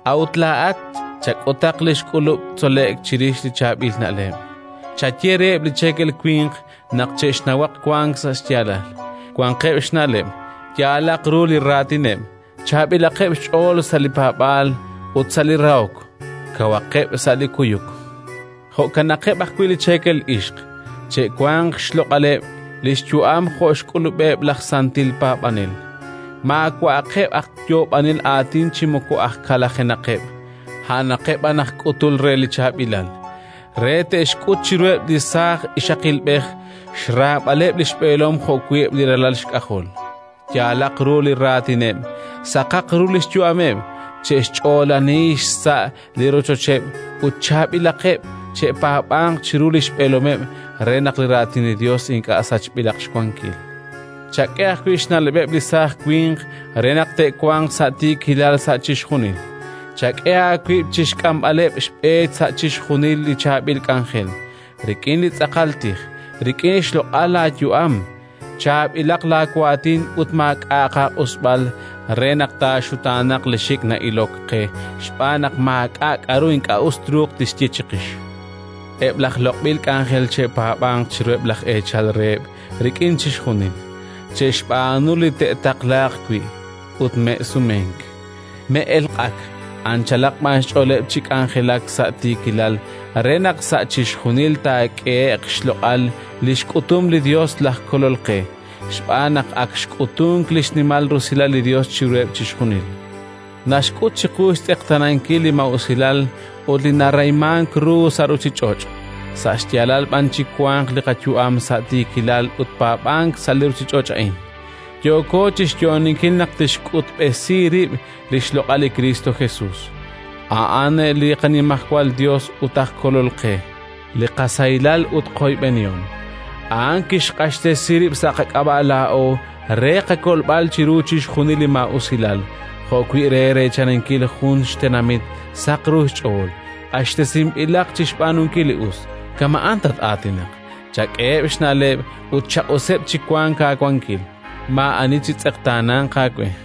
A'ut laa'at chak'utaq li xk'ulub' tzole'k chirix li chaab'il na'leb'. Chaye reheb' li cheekel winq naq che'xnawaq wank sa' xyaalal, wanqeb' xna'leb', yaalaq ru li raatineb', chaab'ilaqeb' xch'ool sa' li paab'aal ut sa' li rahok, kawaqeb' sa' li kuyuk. Jo'kanaqeb' ajwi' li cheekel ixq: che'wanq xloq'aleb' li xyu'am jo' xk'ulub'eb' laj santil paab'anel; maawa'aqeb' aj yoob'anel aatin chi moko aj kalajenaqeb', a'anaqeb' b'an aj k'utul re li chaab'ilal, re te'xk'ut chiruheb' li saaj ixaqilb'ej xraab'aleb' li xb'eelom jo'wi' eb' li ralal xk'ajol. Yaalaq ru li raatineb', saqaq ru li xyu'ameb', che'xch'oolani xsa' li rochocheb' ut chaab'ilaqeb'; che'paab'anq chiru li xb'eelomeb' re naq li Raatin li Yos ink'a' sachb'ilaq xwankil. Chak'e ajwi' xna'leb'eb' li saaj winq re naq te'wanq sa' tiikilal sa' chixjunil. Chak'e aawib' chi xk'amb'aleb' xb'e sa' chixjunil li chaab'il k'anjel: rik'in li tz'aqal tij, rik'in xloq'al laayu'am, chaab'ilaq laawaatin ut maak'a'aq aaq'usb'al, re naq taaxutaanaq li xik' na'ilok qe xb'aan naq maak'a' k'aru ink'a' us truuq tixye chiqix. Eb' laj loq'b'il k'anjel che'paab'anq chiruheb' laj eechal reheb' rik'in chixjunil, che'xb'aanu li te'taqlaaq wi' ut me'sumenk; me'elq'ak, anchalaq b'an xch'ooleb' chi k'anjelak sa' tiikilal re naq sa' chixjunil taak'ehe'q xloq'al li xk'utum li Yos laj Kolol qe. Xb'aan naq ak xk'utunk li xnimal rusilal li Yos chiruheb' chixjunil: naxk'ut chiqu xtz'eqtaanankil li maa'usilal ut li narahimank ru sa' ruuchich'och', sa' xyaalal b'an chiwanq li qayu'am, sa' tiikilal ut paab'ank sa' li ruuchich'och' a'in. Yooko chi xyo'oninkil naq tixk'utb'esi rib' li xloq'al li Kristo Jesus, a'an li qaNimajwal Yos ut aj Kolol qe, li qasahilal ut qoyb'enihom. A'an kixq'axtesi rib' sa' qak'ab'a' laa'o re qakolb'al chiru chixjunil li maa'usilal, jo'wi' re reechaninkil jun xtenamit saq ru xch'ool, q'axtesinb'ilaq chi xb'aanunkil li us. Kama' a'an tat-aatinaq, chak'eheb' xna'leb' ut chaq'useb' chi wanq aawankil. Maa'ani chitz'eqtaananq aawe.